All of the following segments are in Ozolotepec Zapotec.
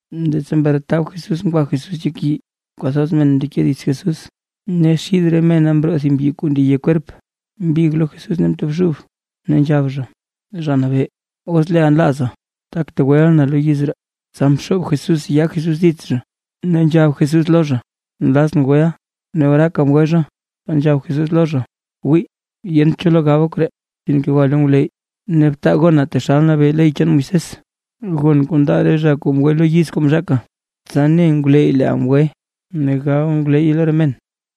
Leettsa mretab Jesús ngwa Jesús yek yii, kwathoz men mndeke dits Jesús. Ne xid re mena mroo thib mbyi kuu ndeye kwerp, mbig lo Jesús ne mtobxub, ne nzhab zha: ―Zha Nabee, os leeʼa nlaaza, tak tegweʼa na lo yiz ree. Tsa mxoob Jesús yaa Jesús dits zha, ne nzhab Jesús lo zha: ―Nlazʼn, weʼa. Ne oraaka mgwe zha. Tsa nzhab Jesús lo zha: ―Wii, yent cho lo gaba koree. Sinke gwa lo ngwleyy ne btaa gona taxal nabee ley chaan Moisés, gon kuu ndaa re zha kuu mgwe lo yiz kuu mzhaaka, tsa ne ngwleyy leeʼa mgweʼa ne gab ngwleyye lo re men.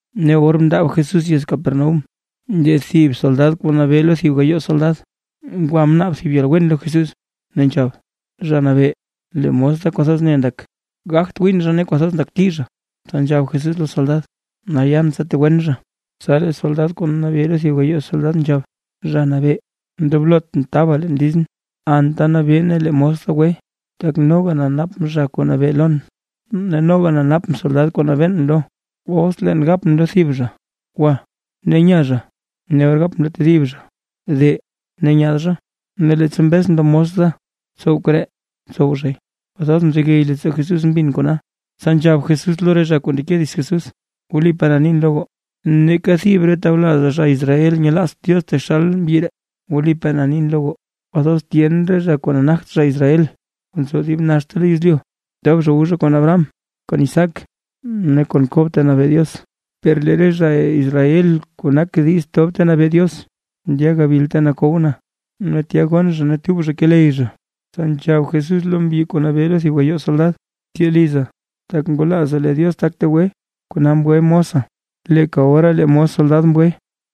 Ne or mndaab Jesús yez Capernaúm, lee thib soldad kuu nabee lo thib gayoo soldad, ngwa mnaab thib yalwen lo Jesús, ne nzhab: ―Zha Nabee, lee mos da kwathoz ne ndak, gagt gwin zha ne kwathoz ndakti zha. Tsa nzhab Jesús lo soldad: ―Nal yan tsa tegwen zha. Tsa lee soldad kuu nabee lo thib gayoo soldad nzhab: ―Zha Nabee, ndoblotʼn taba leen lizʼn, anta nabee ne lee mos da gwe. Tak noga na napʼn zha kuu nabee lon, ne noga na napʼn soldad kuu nabeen lo. Os leen gapʼn lo thib zha: “Gwa”, ne nya zha; ne or gapʼn lo tedib zha “De”, ne nyaad zha; ne leettsa mbezʼn lo mos da “Tsow koree”, ntsow zhay. Kwathoz mzegey leettsoo Jesús mbin Jesús kona, tsa nzhab Jesús lo re zha kuu ndeke dits Jesús: ―Wlipaa na nin lo goo, ¡neeka thib re tawlazaa zha Israel nyelaazt Diox taxal mbyi ree! Wlipaa na nin lo goo, kwathoz tyen re zha kuu nagt zha Israel, kuu nzo dib naxta lo yezlyu, tob zha wu zha kon Abraham, kon Isaac ne kon Kob ta nabee Diox, per lee re zha Israel kuu nak diiz tob ta nabee Diox, ndya gabil ta nakow na, ne tya gonn zha ne tub zha keley zha. Tsa nzhab Jesús lo mbyi kuu nabee lo thib gayoo soldad: ―Tyee liza, tak ngwalaaza lee Diox tak tegwe, kona mgwe mosa. Leeka ora lee mos soldad mgwe.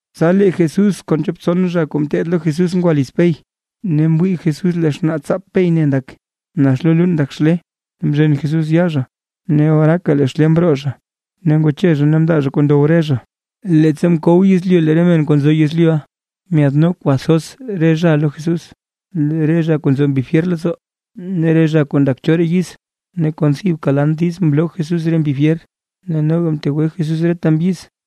Tsa lee Jesús kon chop tson zha kuu ngeteed lo Jesús ngwa liz Pey, ne mwii Jesús lee xnaatsaap Pey ne ndak, nax lo luun ndak xlee. Ne mzhen Jesús yaa zha, ne oraaka lee xlee mroo zha. Ne ngwache zha ne mndaa zha kuu ndow re zha. Leettsa mkow yezlyu lee re men kuu nzo yezlyuʼa, myaadno kwathoz re zha lo Jesús, re zha kuu nzo mbi fyer leettsoo ne re zha kuu ndak choraa yiz, ne kon thibka lan diiz mloo Jesús re mbi fyer, ne noga mtegwe Jesús reta mbyiz.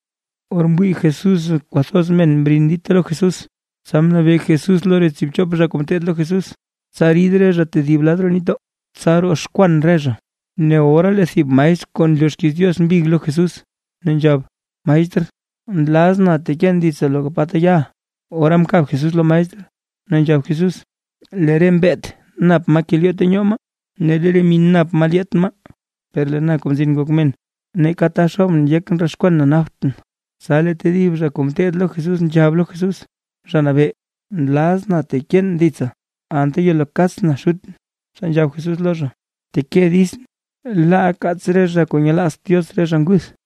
Or mwii Jesús kwathoz men mrin dita lo Jesús, tsa mnabee Jesús lo re tsiibchop zha kuu ngeteed lo Jesús, tsa rid re zha tedib lad roo nitdoo, tsa roxkwan re zha. Ne ora lee thib maestr kuu nloo xkiiz Diox mbig lo Jesús, ne nzhab: ―Maestr, nlazʼn teken ditsa loka pa ta yaʼa. Ora mkab Jesús lo maestr, ne nzhab Jesús: ―Lee re mbeet nap maa kelyoo ta nyoo maa, ne lee re min nap maa lyaat maa; per lee na Kuu Mzin Ngok Men, neeka ta xoobʼn yekʼn roxkwan na naptʼn. Tsa lee tedib zha kuu ngeteed lo Jesús nzhab lo Jesús: ―Zha Nabee, nlazʼn teken ditsa, per laa anta yelo kaatsʼn xutʼn. Tsa nzhab Jesús lo zha: ―Bteke ditsʼn, laa kaats re zha kuu nyelaazt Diox re zha nguth.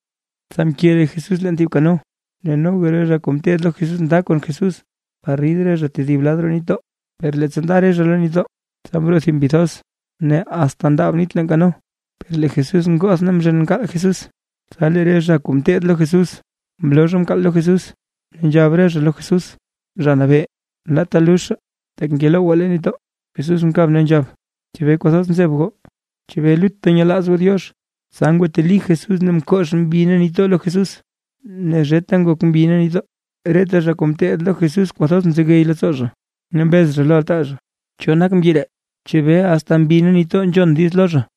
Tsa mke Jesús leen thib kano, ne noga re zha kuu teed lo Jesús nda kon Jesús, par rid re zha tedib lad roo nitdoo. Per leettsa nda re zha lo nitdoo, tsa mroo thib mbi thoz, ne asta ndaab nit leen kano. Per lee Jesús ngoth ne mzhen mkaal Jesús. Tsa lee re zha kuu ngeteed lo Jesús, mloo zha mkaal lo Jesús, ne nzhab re zha lo Jesús: ―Zha Nabee, laata luzhaa, tak ngelowgwaa leen nitdoo. Jesús mkab ne nzhab: ―¿Chebee kwathoz nzeb goo? ¿Chebee lutta nyelaaz goo Diox? Tsa ngwateli Jesús ne mkox mbi ne nitdoo lo Jesús, ne zheta ngok mbi ne nitdoo. Reta zha kuu ngeteed lo Jesús kwathoz mzegey leettsoo zha, ne mbez zha lo altaa zha: ―¿Cho nak mbyi ree? ¿Chebee asta mbi ne nitdoo nzhon diiz lo zha?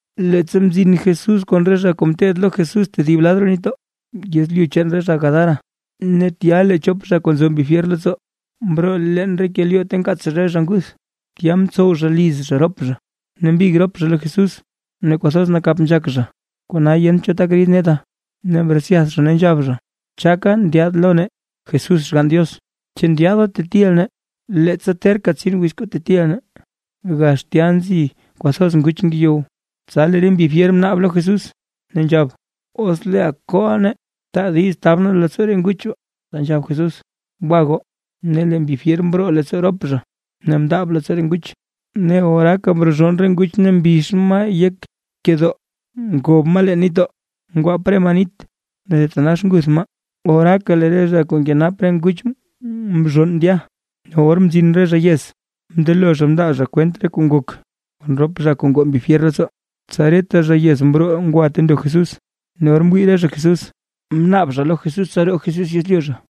Leettsa mzin Jesús kon re zha kuu ngeteed lo Jesús tedib lad roo nitdoo, yezlyu chaan re zha Gadara, ne tya lee chop zha kuu nzo mbi fyer leettsoo, mroo leen re kelyoo ta nkaats zha re zha nguth, tya mtsow zha liz zha rop zha, ne mbig rop zha lo Jesús, ne kwathoz nakap nzhak zha, kona yent cho tak rid neta. Ne mretsyath zha ne nzhab zha: ―¿Chaka ndyaad lo nee, Jesús Xgann Diox? ¿Chu ndyaada tetiʼa nee, leettsa terka tsin wiz kuu tetiʼa nee? Gax tya nzi kwathoz nguch ngeyow. Tsa lee re mbi fyer mnaab lo Jesús, ne nzhab: ―Os leeʼa kooʼa nee, taa diiz tab nee leettsoo re nguch baa. Tsa nzhab Jesús: ―¡Gwa goo! Ne lee re mbi fyer mroo leettsoo rop zhaʼa ne mndaab leettsoo re nguch. Ne oraaka mrozhonn re nguch ne mbix maa yek kedoo ngob maa leen nitdoo, ngwaap re maa nit ne thitanax nguth maa. Oraaka lee re zha kuu nkenap re nguch mzhonn ndya, ne or mzin re zha yez, mndelo zha mndaa zha kwent re kuu ngok, kon rop zha kuu ngoo mbi fyer leettsoo. Tsa reta zha yez mroo ngwa ta ndo Jesús. Ne or mwii re zha Jesús; mnaab zha lo Jesús, tsa roo Jesús yezlyu zha.